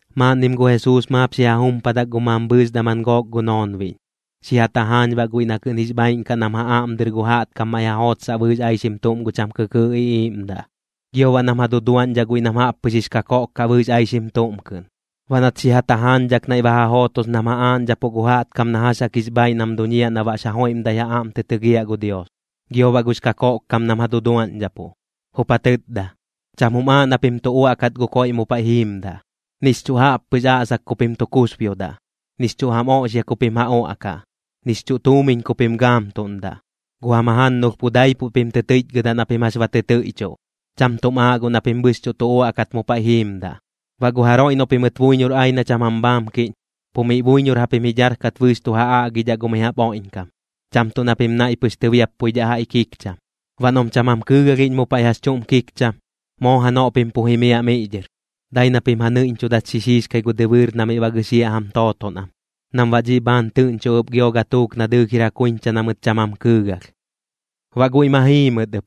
Maaꞌnnim gu Jesuus maap xi ja jumpadak gu mambhɨɨx daman gook gu noonbiꞌñ, xi ja tajaañ baꞌ guiꞌ na kɨꞌn jix bhaaiꞌn kaꞌ nam ja aꞌm dɨr gu jaꞌtkam maiꞌ ja jootsaꞌ bɨɨx aixim tuꞌm gu cham kɨkɨɨꞌ iꞌiiꞌmdaꞌ, gio baꞌ nam ja duduaꞌñdhaꞌ guiꞌ nam jaꞌp pɨx jix kakoꞌk kaꞌ bɨɨx aixim tuꞌm kɨꞌn. Baꞌ nat xi ja tajaañdhak naiꞌ ba ja jootos nam ja aaꞌñdhapuꞌ gu jaꞌtkam na jax jaꞌk jix bhaaiꞌ nam duñiaꞌ na baꞌx ja joiꞌmdat ja aꞌm tɨ tɨgiaꞌ gu Dios, gio baꞌ gux kakoꞌkkam nam ja duduaꞌñdhapuꞌ, jup ja tɨtda: ―Cham jum aaꞌ na pim tu uaꞌkat gu koiꞌ mu paiꞌ jiimdaꞌ, nix chuꞌ jaꞌppɨx aꞌsak ku pim tu kusbiodaꞌ, nix chuꞌ jam oꞌxia ku pim ja uaꞌkaꞌ, nix chuꞌ tuumiñ ku pim gaamtuꞌndaꞌ. Gu jam jajannulh pu daipuꞌ pim tɨ tɨichgɨdaꞌ na pim jax ba tɨ tɨiꞌchuꞌ. Cham tuꞌm aaꞌ guꞌ na pim bɨxchuꞌ tu uaꞌkat mu paiꞌ jiimdaꞌ. Baꞌ gu jaroiꞌ noꞌ pimɨt buiñor ai na cham jam bhaamkiꞌñ, pu miꞌ buiñor japim ji dharkat bɨɨx tu ja aꞌgidhaꞌ gu mi jaꞌp oiꞌñkam, cham tuꞌ na pim naiꞌ pɨx tɨbiappuidhaꞌ jaiꞌ kikcham. Baꞌ noꞌm cham jam kɨɨgalhiꞌñ mu paiꞌ jax chuꞌm kikcham, moo janoꞌ pim pu jimiaꞌ miꞌ dhɨr, dai na pim ja nɨiꞌñchudat xi xiixkai gu dɨbɨɨr na miꞌ ba gɨxiaꞌ jam tooton am, nam baꞌ dhiꞌ bhaan tɨꞌñchoꞌ ɨp gio gatuuk na dɨɨlh jir ja kuiñcha na mɨt cham jam kɨɨgalh. Baꞌ guiꞌ ma jii mɨt ɨp,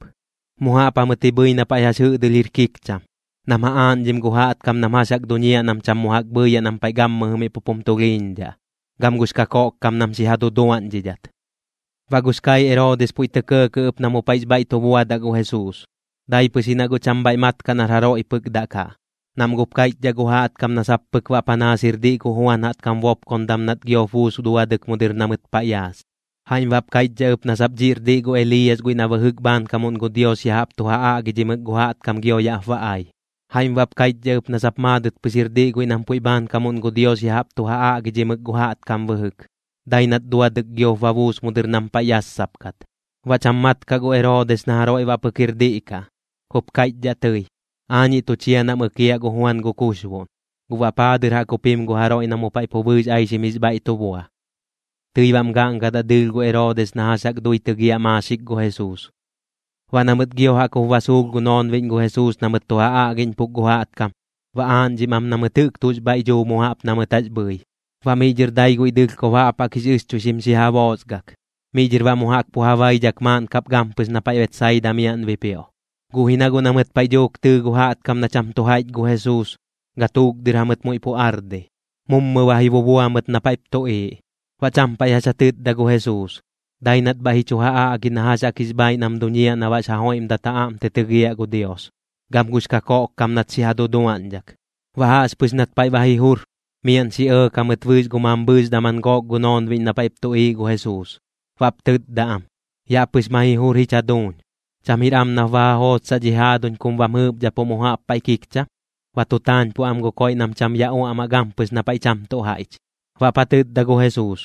mu jaꞌp jamɨt ji bhɨi na paiꞌ jax jɨꞌdɨlh jir kikcham, nam ja aaꞌñdhim gu jaꞌtkam nam jax jaꞌk duñiaꞌ nam cham mu jaꞌk bhɨɨyaꞌ nam paiꞌ gammɨjɨ miꞌ pup jum tulhiiñdhaꞌ, gam gux kakoꞌkkam nam xi ja duduaꞌñdhidhat. Baꞌ gux kaiꞌ Eroodis puiꞌ tɇ kɇɇkɇꞌ ɨp na mu paiꞌx bhaiꞌ tu buadaꞌ gu Jesuus. Dai pɨx ji na guꞌ cham bhaiꞌ mat kaꞌ nar jaroiꞌ pɨk daꞌ kaꞌ, nam guꞌp kaiꞌchdhaꞌ gu jaꞌtkam na sap pɨk baꞌ panaas jir diꞌ gu Juan jaꞌtkam bopkondam nat giop buus duadɨk mu dɨr na mɨt paiꞌ yaas. Jaiꞌm baꞌp kaiꞌchdhaꞌ ɨp na sap dhiꞌr diꞌ gu Eliiyas guiꞌ na bɨjɨk bhaankamuꞌn gu Dios ya jaꞌp tu ja aꞌgidhimɨk gu jaꞌtkam gio yaꞌp ba ai. Jaiꞌm baꞌp kaiꞌchdhaꞌ ɨp na sap maadɨt pɨx jir diꞌ guiꞌ nam puiꞌ bhaankamuꞌn gu Dios ya jaꞌp tu ja aꞌgidhimɨk gu jaꞌtkam bɨjɨk, dai nat duadɨk giop ba buus mu dɨr nam paiꞌ yassap kat. Baꞌ cham mat kaꞌ gu Eroodis na jaroiꞌ baꞌ pɨk jir diꞌ kaꞌ, jup kaiꞌchdhaꞌ tɨi: ―Aañiꞌ tu chia nam ɨkiaꞌ gu Juan gu kuxboꞌn, ¿guꞌ baꞌ paa dɨr jaꞌk jup jim gu jaroiꞌ na mu paiꞌ pu bɨɨx aixim jix bhaiꞌ tu bua? Tɨi baꞌm gaꞌngadaꞌ dɨɨlh gu Eroodis na jax jaꞌk dui tɨgiaꞌ maaxik gu Jesuus. Baꞌ na mɨt gio jaꞌk jup ba suulh gu noonbiꞌñ gu Jesuus na mɨt tu ja aꞌgiꞌñpuk gu jaꞌtkam, ba aaꞌñdhim am na mɨt jɨꞌk tuꞌx bhaiꞌ dhuu mu jaꞌp na mɨt jax bhɨi. Baꞌ miꞌ dhɨr dai guiꞌ dɨlhkob jaꞌp jaꞌk jix ɨxchuixim xi ja boosgak, miꞌ dhɨr baꞌ mu jaꞌk pu ja baidhak maaꞌn kap gampɨx na paiꞌ Betsaida miaꞌn bipioꞌ. Guꞌ ji na guꞌ na mɨt paiꞌ dhuuk tɨɨ gu jaꞌtkam na cham tu jaiꞌch gu Jesuus, gatuuk dɨr jamɨt muiꞌ pu ardi, mummɨ ba ji bubua mɨt na paiꞌp tuꞌiiꞌ. Baꞌ cham paiꞌ jax ja tɨtda gu Jesuus, dai nat bhaiꞌ ji chu ja aꞌgi na jax jaꞌk jix bhaaiꞌ nam duñiaꞌ na baꞌx ja joiꞌmdat ja aꞌm tɨ tɨgiaꞌ gu Dios, gam gux kakoꞌkkam nat xi ja duduaꞌñdhak. Baꞌ jaꞌxpɨx nat paiꞌ ba ji jur, miaꞌn xi ɇɇk jamɨt bɨɨx gu mambhɨɨx daman gook gu noonbiꞌñ na paiꞌp tuꞌiiꞌ gu Jesuus, baꞌp tɨtda am: ―Yaꞌ pɨx ma ji jur jich jaduuñ. ¿Cham jir am nap ba ja jootsaꞌ dhi jaaduñ kum bam jɨɨpdhapuꞌ mu jaꞌp paiꞌ kikcham? Ba tu taañpuꞌ am gu koiꞌ nam cham ya uaꞌmaꞌ gampɨx na paiꞌ cham tuꞌ jaiꞌch. Baꞌp ja tɨtda gu Jesuus: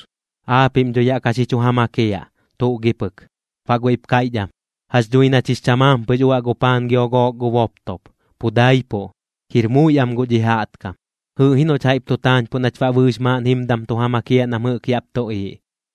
―Aapiꞌm dho yaꞌ ka xi chu ja makiaꞌ, ¿tuꞌ gi pɨk? Baꞌ guiꞌp kaiꞌch am: ―Jax dhui nach jix chamaam pɨx uaꞌ gu paan gio gu gook boptop, pu daipuꞌ. Jir muiꞌ am guꞌ dhi jaꞌtkam. Jɨɨꞌ ji noꞌch jaiꞌp tu taañpuꞌ nach baꞌ bɨɨx maaꞌn jimdam tu ja makiaꞌ nam jɨꞌk yaꞌp tuꞌiiꞌ.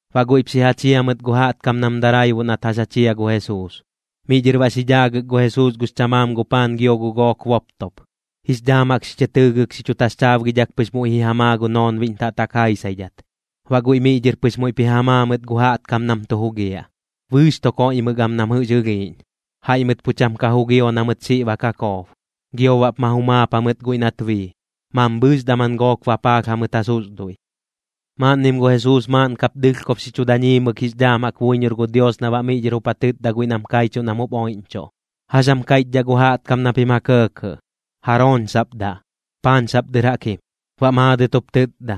Baꞌ guiꞌp xi ja chia mɨt gu jaꞌtkam nam daraibuꞌ nat jax ja chia gu Jesuus. Miꞌ dhɨr baꞌ xi dhaagɨk gu Jesuus gux chamaam gu paan gio gu gook boptop, jix dhaam jaꞌk xi chɨ tɨɨgɨk xi chu taxchaabgidhak pɨx muiꞌ ji ja maa gu noonbiꞌñ taꞌtak jaisaidhat. Baꞌ guiꞌ miꞌ dhɨr pɨx muiꞌp ji ja maa mɨt gu jaꞌtkam nam tu jugiaꞌ. Bɨɨx tu koiꞌmɨk am nam jɨꞌx ɨlhiiꞌñ. Jaiꞌ mɨt pu cham ka jugio na mɨt xiꞌ ba ka koob. Gio baꞌp ma jumaap jamɨt guiꞌ nat bii, mambhɨɨx daman gook bapaalh jamɨt ja susduiꞌ. Maaꞌnnim gu Jesuus maaꞌn kap dɨlhkob xi chu dañiimɨk jix dhaam jaꞌk buiñor gu Dios na baꞌ miꞌ dhɨr jup ja tɨtda guiꞌ nam kaichuꞌ nam jup oiꞌñchuꞌ: ―¿Jax jam kaiꞌchdhaꞌ gu jaꞌtkam na pim ja kɇɇkɇꞌ? ¿Jarooñ sap daꞌ? ¿Paañ sap dɨr jaꞌk jim? Baꞌ maadɨt jup tɨtda: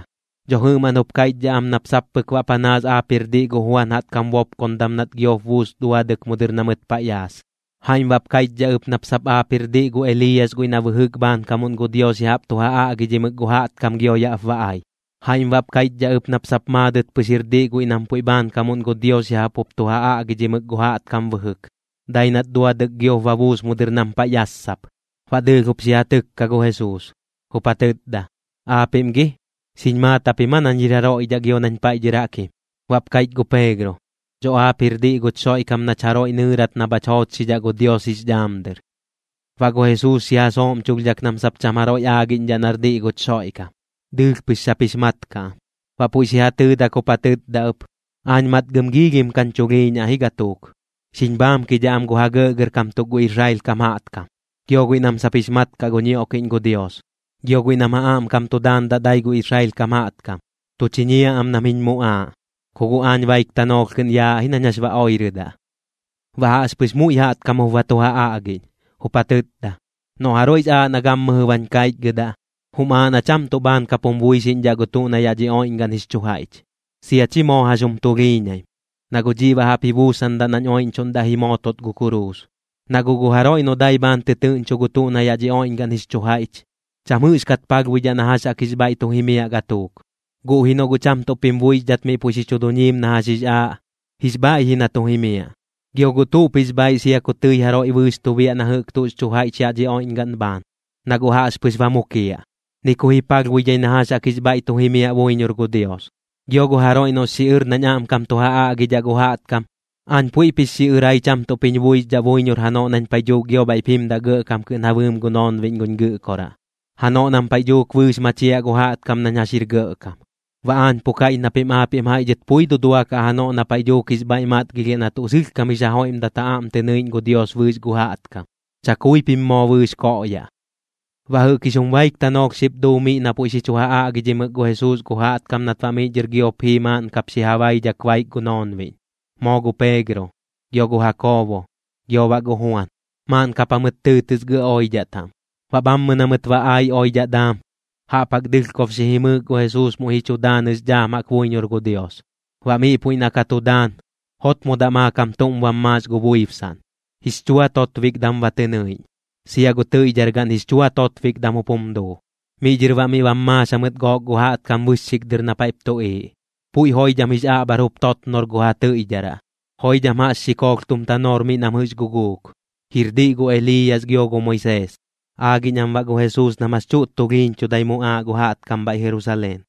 ―Dho jɨꞌmaꞌn jup kaiꞌchdhaꞌ am nap sap pɨk baꞌ panaas aap jir diꞌ gu Juan jaꞌtkam bopkondam nat giop buus duadɨk mu dɨr na mɨt paiꞌ yaas. Jaiꞌm baꞌp kaiꞌchdhaꞌ ɨp nap sap aap jir diꞌ gu Eliiyas guiꞌ na bɨjɨk bhaankamuꞌn gu Dios ya jaꞌp tu ja aꞌgidhimɨk gu jaꞌtkam gio yaꞌp ba ai. Jaiꞌm baꞌp kaiꞌchdhaꞌ ɨp nap sap maadɨt pɨx jir diꞌ guiꞌ nam puiꞌ bhaankamuꞌn gu Dios ya jaꞌp jup tu ja aꞌgidhimɨk gu jaꞌtkam bɨjɨk, dai nat duadɨk giop ba buus mu dɨr nam paiꞌ yassap. Baꞌ dɨɨlh jup xi ja tɨkka gu Jesuus, jup ja tɨtda: ―Aapiꞌm gi, ¿xiñ maat japim aa nañ jir jaroiꞌ dhaꞌ gio nañ paiꞌ dhɨr jaꞌk jim? Baꞌp kaiꞌch gu Peegro: ―Dho aap jir diꞌ guch Xoiꞌkam nach jaroiꞌ nɨɨrat na bhach joochxidhaꞌ gu Dios jix dhaam dɨr. Baꞌ gu Jesuus xi ja sooꞌmchulhdhak nam sap cham jaroiꞌ aagiꞌñdhaꞌ nar diꞌ guch Xoiꞌkam, dɨɨlh pɨx sap jix mat kaꞌ am. Baꞌ puiꞌ xi ja tɨɨdak jup ja tɨtda ɨp: ―Aañ matgɨm giilhim kañ chulhiiñaꞌ ji gatuuk. Xiñ bhaamkidhaꞌ am gu ja gɇꞌgɇrkam tuk gu Israel kam jaꞌtkam, gio guiꞌ nam sap jix mat kaꞌ gu ñioꞌkiꞌñ gu Dios, gio guiꞌ nam ja aꞌmkam tu daandaꞌ dai gu Israel kam jaꞌtkam. Tu chiñiaꞌ am nam jiñ muꞌaaꞌ, ku guꞌ aañ baik tanoolh kɨꞌn yaaꞌ ji nañ jax ba oirɨdaꞌ. Baꞌ jaꞌxpɨx muiꞌ jaꞌtkam jup ba tu ja aꞌgiꞌñ, jup ja tɨtda: ―Noꞌ jaroiꞌx aaꞌ na gammɨjɨ bañ kaichgɨdaꞌ, jum aaꞌ na cham tuꞌ bhaan kap jum buixiꞌñdhaꞌ gu tuꞌ na yaꞌ dhi oiꞌñgaꞌn jix chu jaiꞌch, sia chi moo jax jum tulhiiñaim, na guꞌ dhiꞌ baꞌ jaꞌp ji buusandaꞌ nañ oiꞌñchuꞌndaꞌ ji mootot gu kuruus. Na guꞌ gu jaroiꞌ noꞌ dai bhaan tɨtɨɨꞌñcho gu tuꞌ na yaꞌ dhi oiꞌñgaꞌn jix chu jaiꞌch, cham jɨꞌxkat palhbuidhaꞌ na jax jaꞌk jix bhaiꞌ tu jimiaꞌ gatuuk. Guꞌ ji noꞌ guꞌ cham tuꞌp jim buixdhat miꞌ puiꞌ xi chu duñiim nañ jax jix aaꞌ, jix bhaiꞌ ji na tu jimiaꞌ. ¿Gio guꞌ tuꞌp jix bhaiꞌ sia ku tɨi jaroiꞌ bɨɨx tu biaꞌ na jɨꞌk tuꞌx chu jaiꞌch yaꞌ dhi oiꞌñgaꞌn bhaan, noꞌ guꞌ jaꞌxpɨx ba mukiaꞌ? Ni ku ji palhbuidhai na jax jaꞌk jix bhaiꞌ tu jimiaꞌ buiñor gu Dios. Gio gu jaroiꞌ noꞌx xiꞌɨr nañ aꞌmkam tu ja aꞌgidhaꞌ gu jaꞌtkam, aañ puiꞌp jix xiꞌɨrai cham tuꞌp jiñ buixdhaꞌ buiñor janoꞌ nañ paiꞌ dhuuk gio bhaiꞌp jimdaꞌ gɇꞌkam kɨꞌn ja bɨɨm gu noonbiꞌñ guñ Gɨꞌkoraꞌ, janoꞌ nam paiꞌ dhuuk bɨɨx machiaꞌ gu jaꞌtkam nañ jax jir gɇꞌkam. Baꞌ aañ pu kaiꞌch na pim aapiꞌm jaiꞌ dhɨt pui duduakaꞌ janoꞌ na paiꞌ dhuuk jix bhaiꞌ matgilhiaꞌ na tuꞌ sɨlhkam jix ja joiꞌmdat ja aꞌm tɨ nɨiꞌñ gu Dios bɨɨx gu jaꞌtkam, chakui pim moo bɨɨx koꞌyaꞌ. Baꞌ jɨꞌk jix jum baik tanoolh xip duu miꞌ na puiꞌ xi chu ja aꞌgidhimɨk gu Jesuus gu jaꞌtkam nat baꞌ miꞌ dhɨr giop jii maaꞌn kap xi ja baidhak baik gu noonbiꞌñ, moo gu Peegro, gio gu Jakoobo, gio baꞌ gu Juan, maaꞌn kap jamɨt tɨɨtɨs gɇꞌ oidhaꞌ taꞌm. Baꞌ bhammɨ na mɨt ba ai oidhaꞌ daam, jaꞌp jaꞌk dɨlhkob xi jimɨɨk gu Jesuus muiꞌ ji chu daanɨx dhaam jaꞌk buiñor gu Dios. Baꞌ miꞌ puiꞌ na ka tu daan, jotmodaꞌ maakam tuꞌm bam maax gu buibsaꞌn, jix chua totbikdam ba tɨ nɨiꞌñ. Sia gu tɨiꞌdhar gaꞌn jix chua totbikdam jup jum duu. Miꞌ dhɨr baꞌ miꞌ bam maax jamɨt gook gu jaꞌtkam bɨxxik dɨr na paiꞌp tuꞌiiꞌ, puiꞌ joidham jix aꞌbhar jup totnor gu ja tɨiꞌdharaꞌ, joidham jaꞌx xikoolh tum tanoor miꞌ nam jɨꞌx guguuk, jir diꞌ gu Eliiyas gio gu Moisees. Aagiꞌñ am baꞌ gu Jesuus nam jax chuꞌt tulhiiñchudai muꞌaaꞌ gu jaꞌtkam bhaiꞌ Jerusaleen.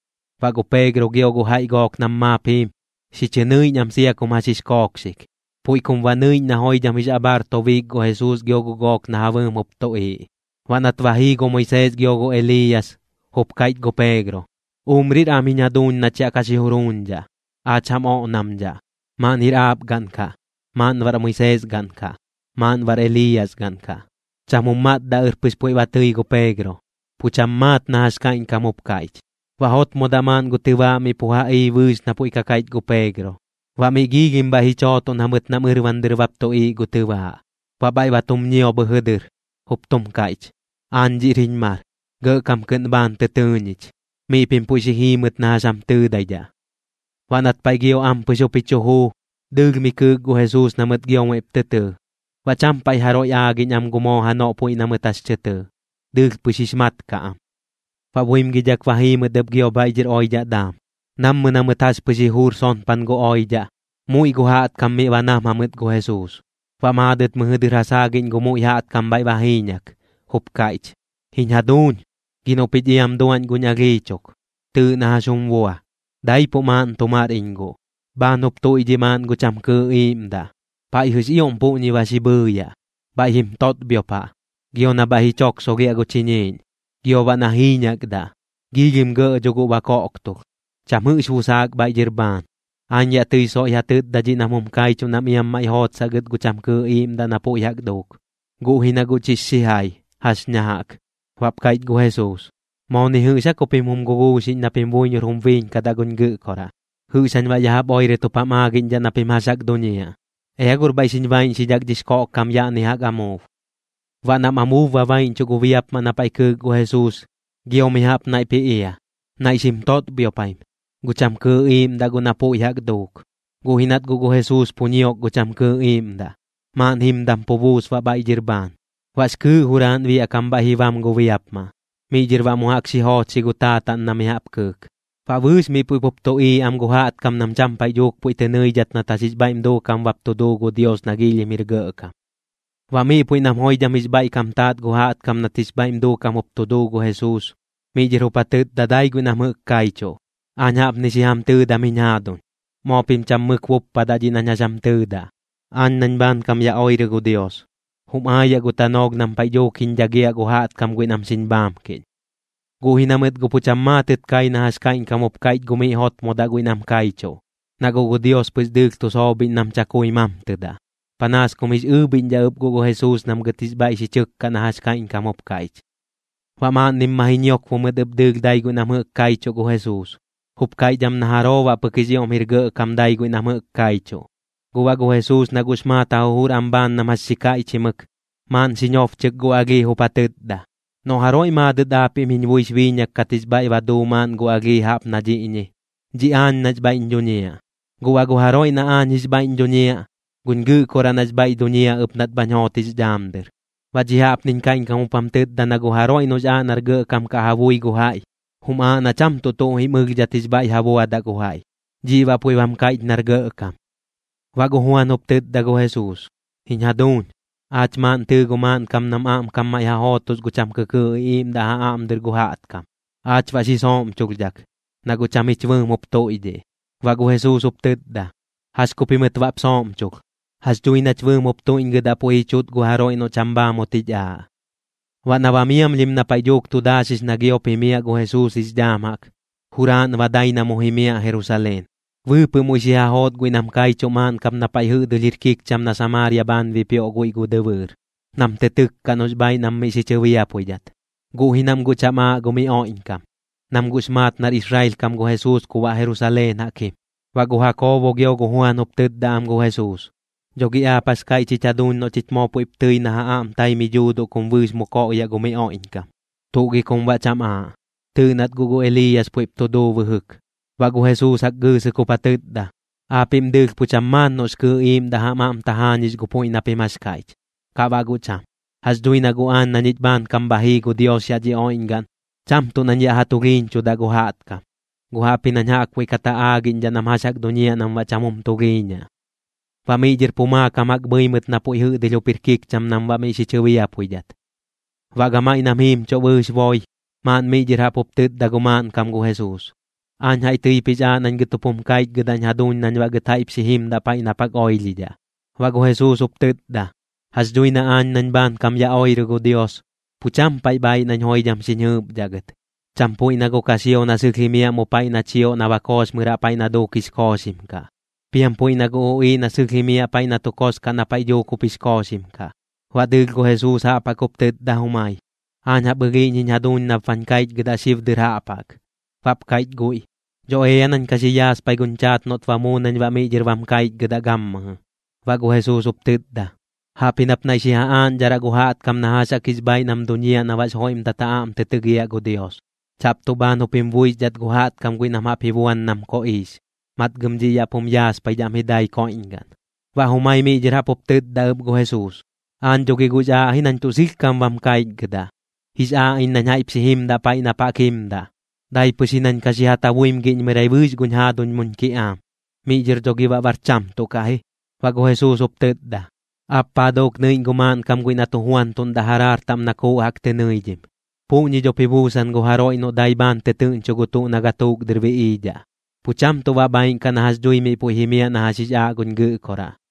Baꞌ gu Peegro gio gu jaiꞌ gook nam maap jiim, xi chɨ nɨiꞌñ am sia kum jax jix kookxik, puiꞌ kum baꞌ nɨiꞌñ na joidham jix abhaar tobiik gu Jesuus gio gu gook na ja bɨɨm jup tuꞌiiꞌ. Baꞌ nat ba ji jii gu Moisees gio gu Eliiyas, jup kaiꞌch gu Peegro: ―Umrir am jiñ jaduuñ nach yaꞌ ka xi juruuñdhaꞌ. Aach jam oꞌnamdhaꞌ, maaꞌn jir aap gaꞌn kaꞌ, maaꞌn baꞌr Moisees gaꞌn kaꞌ, maaꞌn baꞌr Eliiyas gaꞌn kaꞌ. Cham jum matdaꞌɨr pɨx puiꞌ tɨi gu Peegro, pu cham maat na jax kaiꞌñkam jup kaiꞌch. Baꞌ jotmodaꞌ maaꞌn gu tɨbaaꞌ miꞌ pu ja ii bɨɨx na puiꞌ ka kaiꞌch gu Peegro. Baꞌ miꞌ giilhim bhaiꞌ ji chootoꞌn jamɨt nam ɨrban dɨr bap tuꞌiiꞌ gu tɨbaaꞌ. Baꞌ bhaiꞌ ba tum ñio bhɨjɨ dɨr, jup tum kaiꞌch: ―Aañ dhiꞌr jiñ mar. Gɇꞌkam kɨꞌn bhaan tɨ tɨɨ ñich. Miꞌ pim puiꞌ xi jiimɨt na jax jam tɨɨdaidhaꞌ. Baꞌ nat paiꞌ gio ampɨx jup ji chu juu, dɨɨlh mi kɨɨk gu Jesuus na mɨt gio muiꞌp tɨ tɨɨ. Baꞌ cham paiꞌ jaroiꞌ aagiꞌñ am gu moo janoꞌ puiꞌ na mɨt jax tɨ tɨɨ, dɨɨlh pɨx jix mat kaꞌ am. Baꞌ buimgidhak ba jii mɨt ɨp gio bhaiꞌ dhɨr oidhaꞌ daam. Nammɨ na mɨt jax pɨx ji juur sonpan gu oidhaꞌ, muiꞌ gu jaꞌtkam miꞌ ba nam jamɨt gu Jesuus. Baꞌ maadɨt mɨjɨ dɨr ja saagiꞌñ gu muiꞌ jaꞌtkam bhaiꞌ ba jiiñak, jup kaiꞌch: ―Jiñ jaduuñ, gi noꞌ pich iam duaꞌñ guñ alhii chuk. Tɨɨꞌ na jax jum bua. Daipuꞌ maaꞌn tu mar iñ guꞌ. Bhaan jup tuiꞌdhiꞌ maaꞌn gu cham kɨɨꞌ iiꞌmdaꞌ. Paiꞌjɨx ioꞌm puꞌñi ba xi bhɨɨyaꞌ, bhaiꞌ jim totbhiopaꞌ, gio na bhaiꞌ ji choksolhiaꞌ gu chiñiiꞌñ, gio baꞌ na jiiñakdaꞌ. Giilhim gɇꞌ dho guꞌ ba koꞌktulh. Cham jɨꞌx busaak bhaiꞌ dhɨr bhaan. Aañ yaꞌ tɨi soiꞌ ja tɨtda dhiꞌ nam jum kaichuꞌ nam iam maiꞌ jootsaꞌ gɨt gu cham kɨɨꞌ iiꞌmdaꞌ na puiꞌ jaꞌk duuk, guꞌ ji na guꞌ chix xijai, ¿jax ña jaꞌk? Baꞌp kaiꞌch gu Jesuus: ―¿Moo ni jɨꞌx aa ku pim jum guguuxiꞌñdhaꞌ na pim buiñor jum biiñkadaꞌ guñ Gɨꞌkoraꞌ? ¿Jɨꞌx jañ baꞌ ya jaꞌp oirɨt jup jam aꞌgiꞌñdhaꞌ na pim jax jaꞌk duñiaꞌ? Ea gor bhaiꞌ xiñ baiꞌñxidhak dhix koꞌkkam yaꞌni jaꞌk amuub. Baꞌ nam amuub ba baiꞌñchuꞌ gu biapmaꞌ na paiꞌ kɨɨk gu Jesuus, gio mi jaꞌp naiꞌp ji ia, naiꞌ xim totbhiopaim, gu cham kɨɨꞌ iiꞌmdaꞌ guꞌ na puiꞌ jaꞌk duuk. Guꞌ ji nat guꞌ gu Jesuus pu ñiok gu cham kɨɨꞌ iiꞌmdaꞌ, maaꞌn jimdam pu buus baꞌ bhaiꞌ dhɨr bhaan. Baꞌx kɨɨꞌ juraaꞌn biaꞌ kam bhaiꞌ ji bam gu biapmaꞌ. Miꞌ dhɨr baꞌ mu jaꞌk xi joochxi gu taataꞌn na mi jaꞌp kɨɨk. Baꞌ bɨɨx miꞌ puiꞌ pup tuꞌiiꞌ am gu jaꞌtkam nam cham paiꞌ dhuuk puiꞌ tɨ nɨidhat nat jax jix bhaiꞌm duukam bap tu duu gu Dios nax ioꞌm jir gɇꞌkam. Baꞌ miꞌ puiꞌ nam joidham jix bhaiꞌkam taat gu jaꞌtkam nat jix bhaiꞌm duukam jup tu duu gu Jesuus, miꞌ dhɨr jup ja tɨtda dai guiꞌ nam jɨꞌk kaichuꞌ: ―Aañ jaꞌpni xi jam tɨɨdam jiñ jaaduñ, moo pim cham mɨk buppadaꞌ dhiꞌ nañ jax jam tɨɨdaꞌ. Aañ nañ bhaankam ya oirɨ gu Dios, jum aayaꞌ gu tanoolh nam paiꞌ dhuuk jiñ dhagiaꞌ gu jaꞌtkam guiꞌ nam xiñ bhaamkiꞌñ. Guꞌ ji na mɨt guꞌ pu cham maatɨt kai na jax kaiꞌñkam jup kaiꞌch gu miꞌ jotmodaꞌ guiꞌ nam kaichuꞌ, na guꞌ gu Dios pɨx dɨɨlh tu soobhiꞌñ nam chakui mamtɨdaꞌ. Panaas kum jix ɨɨbhiꞌñdhaꞌ ɨp guꞌ gu Jesuus nam gɨt jix bhaiꞌ xi chɨkkaꞌ na jax kaiꞌñkam jup kaiꞌch. Baꞌ maaꞌnnim ma ji ñiokbo mɨt ɨp dɨɨlh dai guiꞌ nam jɨꞌk kaichuꞌ gu Jesuus, jup kaiꞌch am na jaroo baꞌ pɨk jix ioꞌm jir gɇꞌkam dai guiꞌ nam jɨꞌk kaichuꞌ. Guꞌ baꞌ gu Jesuus na guꞌx maat ja jujur am bhaan nam jax xi kaiꞌchimɨk, maaꞌn xi ñobchɨk gu alhii jup ja tɨtda: ―Noꞌ jaroiꞌ maadɨt aapiꞌm jiñ buix biiñak kat jix bhaiꞌ ba duu maaꞌn gu alhii jaꞌp na dhiꞌñi, dhiꞌ aañ nax bhaiꞌñ dhuñiaꞌ. Guꞌ baꞌ gu jaroiꞌ na aañ jix bhaiꞌñ dhuñiaꞌ, guñ Gɨꞌkoraꞌ nax bhaiꞌ duñiaꞌ ɨp nat bhañ joot jix dhaam dɨr. Baꞌ dhiꞌ jaꞌpniñ kaiꞌñkam jup jam tɨtda na gu jaroiꞌ noꞌx aaꞌ nar gɇꞌkam kaꞌ ja bui gu jaiꞌ, jum aaꞌ na cham tuꞌ tuꞌ jim ɨlhdhat jix bhaiꞌ ja buadaꞌ gu jaiꞌ, dhiꞌ baꞌ puiꞌ bam kaiꞌch nar gɇꞌkam. Baꞌ gu Juan jup tɨtda gu Jesuus: ―Jiñ jaduuñ, aach maaꞌn tɨɨ gu maaꞌnkam nam aꞌmkam maiꞌ ja jootos gu cham kɨkɨɨꞌ iꞌiiꞌmdaꞌ ja aꞌm dɨr gu jaꞌtkam. Aach baꞌ xi sooꞌmchulhdhak, na guꞌ cham jich bɨɨm jup tuiꞌdhiꞌ. Baꞌ gu Jesuus jup tɨtda: ―¿Jax ku pimɨt baꞌp sooꞌmchulh? Jax dhui nach bɨɨm jup tuiꞌñgɨdaꞌ puiꞌ ji chuꞌt gu jaroiꞌ noꞌ cham bhaamut jich aaꞌ. Baꞌ na ba miamlhim na paiꞌ dhuuk tu daaxix na giop ji jimiaꞌ gu Jesuus jix dhaam jaꞌk, juraaꞌn ba dai na mu jimiaꞌ Jerusaleen. Bɨɨpɨꞌ muiꞌ xi ja joot guiꞌ nam kaichuꞌ maaꞌn kap na paiꞌ jɨꞌdɨlh jir kikcham na Samaaria bhaan bipioꞌ guiꞌ gu dɨbɨɨr, nam tɨ tɨkkaꞌ noꞌx bhaaiꞌ nam miꞌ xi chɨbiapuidhat. Guꞌ ji nam guꞌ cham aaꞌ gu mi oiꞌñkam, nam guꞌx maat nar Israel kam gu Jesuus ku baꞌ Jerusaleen jaꞌk jim. Baꞌ gu Jakoobo gio gu Juan jup tɨtda am gu Jesuus: ―¿Dho gi aap jax kaiꞌch jich jaduuñ noꞌ chich moo puiꞌp tɨi na ja aꞌm tai mi dhuuduꞌ kum bɨɨx mu koꞌyaꞌ gu mi oiꞌñkam? ¿Tuꞌ gi kum baꞌ cham aaꞌ? Tɨɨꞌ nat guꞌ gu Eliiyas puiꞌp tu duu bɨjɨk. Baꞌ gu Jesuus jaꞌk gɨɨsɨk jup ja tɨtda: ―Aapiꞌm dɨɨlh pu cham maat noꞌx kɨɨꞌ iiꞌmdaꞌ jam aꞌm tajaañix gu puiꞌ na pim jax kaiꞌch, kaꞌ baꞌ guꞌ cham. Jax dhui na guꞌ aañ na ñich bhaankam bha jii gu Dios yaꞌ dhi oiꞌñgaꞌn, cham tuꞌ nañ yaꞌ ja tulhiiñchudaꞌ gu jaꞌtkam, guꞌ jaꞌpji nañ jaꞌkbuiꞌ kat ja aagiꞌñdhaꞌ nam jax jaꞌk duñiaꞌ nam baꞌ cham jum tulhiiñaꞌ. Baꞌ miꞌ dhɨr pu maakam jaꞌk bhɨi mɨt na puiꞌ jɨꞌdɨlh jup jir kikcham nam baꞌ miꞌ xi chɨbiapuidhat. Baꞌ gamaiꞌ nam jiimchuꞌ bɨɨx boi, maaꞌn miꞌ dhɨr jaꞌp jup tɨtda gu maaꞌnkam gu Jesuus: ―Aañ jaiꞌ tɨip jix aaꞌ nañ gɨt jup jum kaichgɨdaꞌñ jaduuñ nañ baꞌ gɨt jaiꞌp xi jimdaꞌ paiꞌ nap jaꞌk oilhidhaꞌ. Baꞌ gu Jesuus jup tɨtda: ―Jax dhui na aañ nañ bhaankam ya oirɨ gu Dios, pu cham paiꞌ bhaaiꞌ nañ joidham xiñ jɨɨpdhaꞌ gɨt, cham puiꞌ na gu kaxio na sɨlh jimiaꞌ mu paiꞌ na chioꞌ na ba kooxmɨraꞌ paiꞌ na duuk jix kooxim kaꞌ, piam puiꞌ na gu uꞌiiꞌ na sɨlh jimiaꞌ paiꞌ na tu kos kaꞌ na paiꞌ dhuuk jup jix kooxim kaꞌ. Baꞌ dɨɨlh gu Jesuus jaꞌp jaꞌk jup tɨtda jumai: ―Aañ jaꞌp ɨlhiiꞌñ jiñ jaduuñ nap bañ kaichgɨdaꞌ xib dɨr jaꞌp jaꞌk. Baꞌp kaiꞌch guiꞌ: ―Dho ea nañ ka xi yaaspai guñ chaat noꞌt ba muu nañ baꞌ miꞌ dhɨr bam kaichgɨdaꞌ gammɨjɨ. Baꞌ gu Jesuus jup tɨtda: ―Jaꞌpji nap naiꞌ xi ja aaꞌñdharaꞌ gu jaꞌtkam na jax jaꞌk jix bhaaiꞌ nam duñiaꞌ na baꞌx joiꞌmdat ja aꞌm tɨ tɨgiaꞌ gu Dios, chaꞌp tuꞌ bhaan jup jim buixdhat gu jaꞌtkam guiꞌ nam jaꞌp ji buan nam koꞌiix. Matgɨm dhiꞌ yaꞌ pum yaaspaidhaꞌm ji dai koiꞌñgaꞌn. Baꞌ jumai miꞌ dhɨr jaꞌp jup tɨtda ɨp gu Jesuus: ―Aañ dho gi guꞌx aaꞌ ji nañ tuꞌ sɨlhkam bam kaichgɨdaꞌ, jix aaꞌ iñ nañ jaiꞌp xi jimdaꞌ paiꞌ nap jaꞌk jimdaꞌ. Dai pɨx ji nañ ka xi ja tabuimgiꞌñmɨrai bɨɨx guñ jaaduñ muñ kiꞌaam, miꞌ dhɨr dho gi baꞌ guꞌ bar cham tuꞌ kaꞌ ji. Baꞌ gu Jesuus jup tɨtda: ―¿Aap paa duuk nɨiꞌñ gu maaꞌnkam guiꞌ na tu juantuꞌndaꞌ jaraar taꞌm na kuuꞌ jaꞌk tɨ nɨidhim? Puꞌñi dhop ji buusan gu jaroiꞌ noꞌ dai bhaan tɨtɨɨꞌñcho gu tuꞌ na gatuuk dɨr biꞌiidhaꞌ, pu cham tuꞌ baꞌ bhaaiꞌn kaꞌ na jax dhui miꞌ puiꞌ jimiaꞌ na jax jix aaꞌ guñ Gɨꞌkoraꞌ.